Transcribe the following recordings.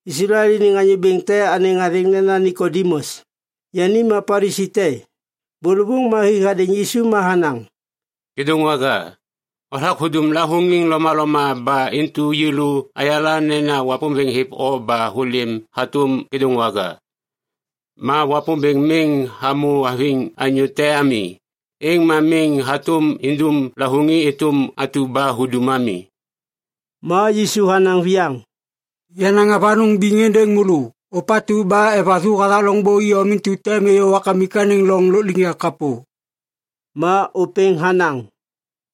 Islael iniŋ anyô bêŋ te anêŋ athêŋ nena Nikodimus. Yani ma Palisi te. Bôlôvôŋ ma hi hadêŋ Yisu ma hanaŋ, “Kêdôŋwaga, hothak hudum lavôŋiŋ lomaloma ba intu yêlô ayala nena Wapômbêŋ hêv o ba hôlêm hatôm kêdôŋwaga. Ma Wapômbêŋ miŋ hamô haviŋ anyô te ami, êŋ ma miŋ hatôm indum lavôŋiŋ êtôm atu ba hudum ami.” Ma Yisu hanaŋ viyaŋ, “Yanaŋ avanôŋ biŋ êndêŋ môlô. Ôpatu ba evathu hathak loŋbô iyom intu tem êyô Wapômbêŋ anêŋ loŋ lôkliŋyak kapô.” Ma ôpêŋ hanaŋ,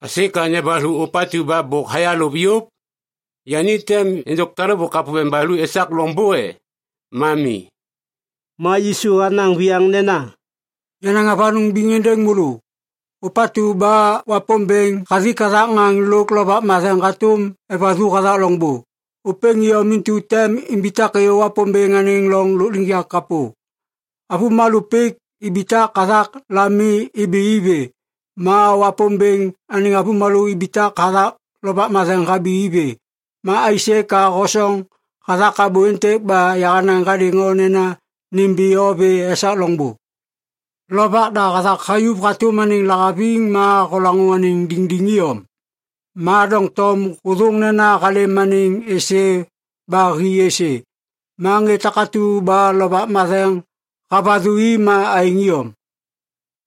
“Aisê ka nembathu ôpatu ba bôk hayalôv yôv? Yani tem êndôk talêbô kapô ba nembathu esak loŋbô e? Ma mi!” Ma Yisu hanaŋ viyaŋ nena, “Yanaŋ avanôŋ biŋ êndêŋ môlô. Ôpatu ba Wapômbêŋ hathik hathak ŋaŋ lôk Lovak Matheŋ hatôm evathu hathak loŋbô, ôpêŋ iyom intu tem imbitak êyô Wapômbêŋ anêŋ loŋ lôkliŋyak kapô. Avômalô pik ibitak hathak lami ibi i vê. Ma Wapômbêŋ anêŋ avômalô ibitak hathak Lovak Matheŋ habi i vê. Ma aisê ka hosoŋ hathak abô êntêk ba yahanaŋ hadêŋ o nena ‘nimbi o vê esak loŋbô.’ Lovak da hathak hayuv hatôm anêŋ lahaviŋ ma holaŋô anêŋ diŋdiŋ iyom. Ma doŋtom hôthôŋ nena halêm anêŋ êsê ba hi êsê. Ma ŋê takatu ba Lovak Matheŋ havathu i ma aêŋ iyom.”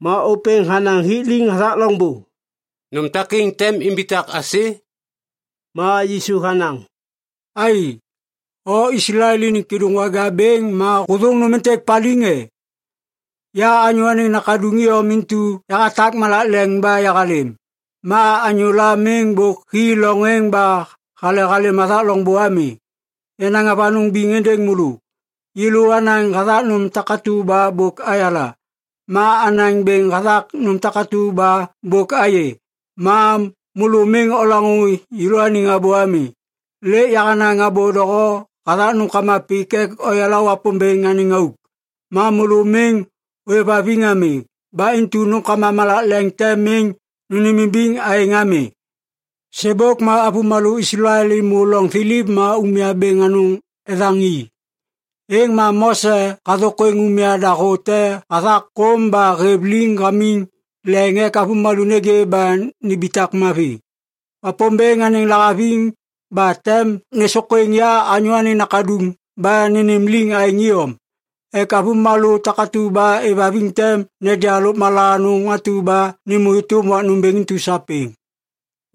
Ma ôpêŋ hanaŋ hik liŋ hathak loŋbô, “Nôm takêŋ tem imbitak aisê?” Ma Yisu hanaŋ, “Ai! O Islael iniŋ kêdôŋwaga bêŋ ma hôthôŋ nôm êntêk paliŋ, e? Ya Anyô Anêŋ Nakaduŋ iyom intu yahatak malak leŋ ba yahalêm. Ma anyôla miŋ bôk hi loŋ êŋ ba hale halêm hathak loŋbô ami. Yanaŋ avanôŋ biŋ êndêŋ môlô. Yêlô anaŋ hathak nôm takatu ba bôk ayala. Ma anaŋ bêŋ hathak nôm takatu ba bôk ayê. Ma môlô miŋ olaŋô yêlôaniŋ abô ami. Lêk yahanaŋ abô doho hathak nômkama pik ek oyala Wapômbêŋ anêŋ auk. Ma môlô miŋ ôêvhaviŋ ami. Ba intu nômkama malak leŋ tem miŋ nônêmimbiŋ aêŋ ami. Sêbôk ma avômalô Islael êmô loŋ thiliv ma umya bêŋ anôŋ ethaŋ i. Êŋ ma Mose hathôkwêŋ umya dahô te hathak kôm ba hêv liŋ hamiŋ leŋ ek avômalô nêgê ba nimbitak mavi. Wapômbêŋ anêŋ lahaviŋ ba tem nêsôkwêŋ ya Anyô Anêŋ Nakaduŋ ba nênêm liŋ aêŋ iyom ek avômalô takatu ba êvhaviŋ tem neja lôkmala anôŋ atu ba nêmô êtôm wak nômbêŋ intu sapêŋ.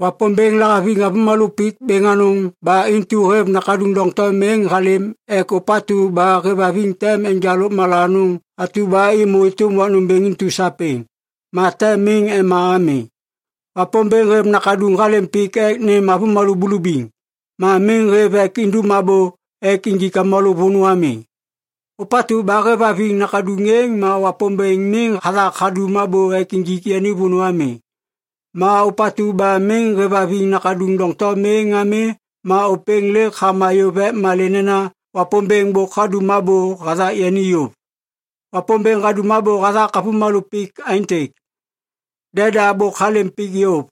“Wapômbêŋ lahaviŋ avômalô pik bêŋ anôŋ ba intu hêv Nakaduŋ doŋtom êŋ halêm ek ôpatu ba hêvhaviŋ tem enja lôkmala anôŋ atu ba êmô êtôm wak nômbêŋ intu sapêŋ. Ma tem miŋ ema ami. Wapômbêŋ hêv Nakaduŋ halêm pik ek nêm avômalô bulubiŋ. Ma miŋ hêv ek indum abô ek injik avômalô vônô ami. Ôpatu ba hêvhaviŋ Nakaduŋ êŋ ma Wapômbêŋ miŋ hathak hadum abô ek injik yani vônô ami. Ma ôpatu ba miŋ hêvhaviŋ Nakaduŋ doŋtom êŋ ami ma ôpêŋ lêk hama yôv ek malê nena Wapômbêŋ bôk hadum abô hathak yani yôv. Wapômbêŋ hadum abô hathak avômalô pik aêntêk. Deda bôk halêm pik yôv.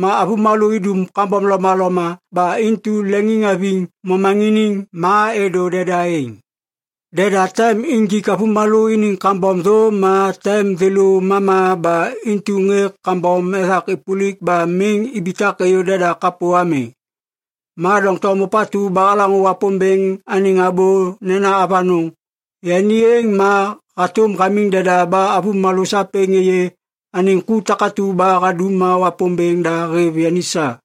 Ma avômalô idum kambom lomaloma ba intu leŋiŋhaviŋ momaŋiniŋ ma êdô deda êŋ. Deda tem injik avômalô iniŋ kambom thô ma tem thêlô mama ba intu ŋê kambom ethak êpôlik ba miŋ ibitak êyô deda kapô ami. Ma doŋtom ôpatu ba halaŋô Wapômbêŋ anêŋ abô nena avanôŋ, yani êŋ ma hatôm hamiŋ deda ba avômalô sapêŋ êyê anêŋ ku takatu ba hadum ma Wapômbêŋ da hêv yani sa.”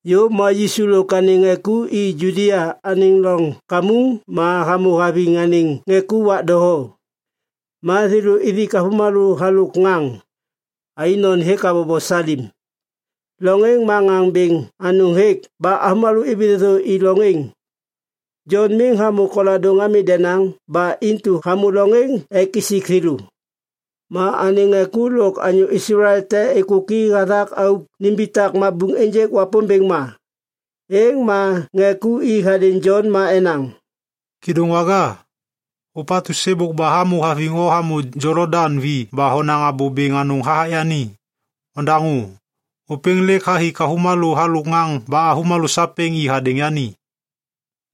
Yôv ma Yisu lôk anêŋ ŋê ku i Judia anêŋ loŋ kamuŋ ma hamô haviŋ anêŋ ŋê ku wak doho. Ma thêlô ithik avômalô halôk ŋaŋ. Ainon hêk habobo Salim. Loŋ êŋ ma ŋaŋ bêŋ anôŋ hêk ba avômalô ibi thêthô i loŋ êŋ. Jon miŋ hamô koladôŋ ami denaŋ, ba intu hamô loŋ êŋ ek isik thêlô. Ma anêŋ ŋê ku lôk anyô Islael te êkôki hathak auk nimbitak mabuŋ ênjêk Wapômbêŋ ma. Êŋ ma ŋê ku i hadêŋ Jon ma enaŋ, “Kêdôŋwaga! Ôpatu sêbôk ba hamô haviŋ o hamô Jolodaŋ vi ba honaŋ abô bêŋ anôŋ hathak yani. Ondaŋô! Ôpêŋ lêk hathik avômalô halôk ŋaŋ ba avômalô sapêŋ i hadêŋ yani!”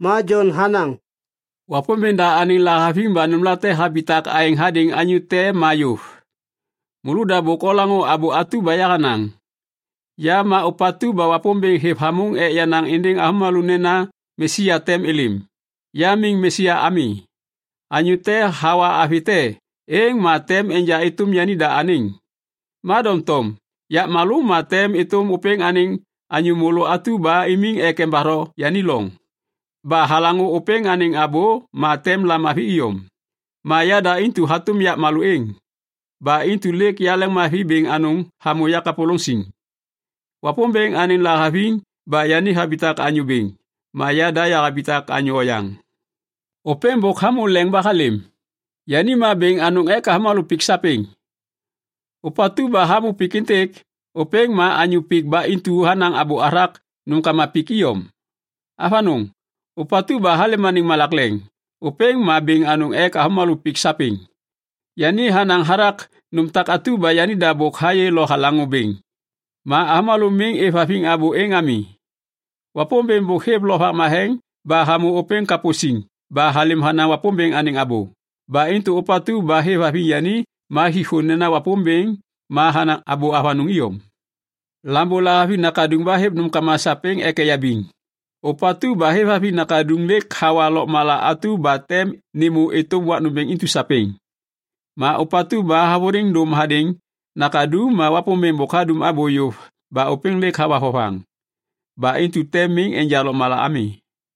Ma Jon hanaŋ, “Wapômbêŋ da anêŋ lahaviŋ ba nômlate habitak aêŋ hadêŋ anyô te ma yôv. Môlôda bôk olaŋô abô atu ba yahanaŋ. ‘Ya ma ôpatu ba Wapômbêŋ hêv hamôŋ ek yanaŋ êndêŋ avômalô nena Mesia tem êlêm. Ya miŋ Mesia ami.’ Anyô te hawa avi te, êŋ ma tem enja êtôm yanida anêŋ. Ma doŋtom yapmalô ma tem êtôm ôpêŋ anêŋ anyô môlô atu ba imiŋ ek embatho yani loŋ. Ba halaŋô ôpêŋ anêŋ abô ma tem lamavi iyom. Ma yada intu hatôm yapmalô êŋ. Ba intu lêk yaleŋmavi bêŋ anôŋ hamô yakapôlôŋ siŋ. Wapômbêŋ anêŋ lahaviŋ ba yani habitak anyô bêŋ, ma yada yahabitak anyô oyaŋ.” “Ôpêŋ bôk hamô leŋ ba halêm, yani ma bêŋ anôŋ ek avômalô pik sapêŋ. Ôpatu ba hamô pik êntêk, ôpêŋ ma anyô pik ba intu hanaŋ abô hathak nômkama pik iyom. Avanôŋ! Ôpatu ba halêm anêŋ malak leŋ, ôpêŋ ma bêŋ anôŋ ek avômalô pik sapêŋ. Yani hanaŋ hathak nôm takatu ba yanida bôk hayê lo halaŋô bêŋ. Ma avômalô miŋ êvhaviŋ abô êŋ ami. Wapômbêŋ bôk hêv Lovak Matheŋ ba hamô ôpêŋ kapô siŋ ba halêm hanaŋ Wapômbêŋ anêŋ abô. Ba intu ôpatu ba hêvhaviŋ yani ma hik thô nena Wapômbêŋ ma hanaŋ abô avanôŋ iyom. Lambô lahaviŋ Nakaduŋ ba hêv nômkama sapêŋ ek eyabiŋ. Ôpatu ba hêvhaviŋ Nakaduŋ lêk hawa lôkmala atu ba tem nêmô êtôm wak nômbêŋ intu sapêŋ. Ma ôpatu ba havôliŋ dôm hadêŋ Nakaduŋ ma Wapômbêŋ bôk hadum abô yôv ba ôpêŋ lêk hawa vovaŋ. Ba intu tem miŋ enja lôkmala ami.”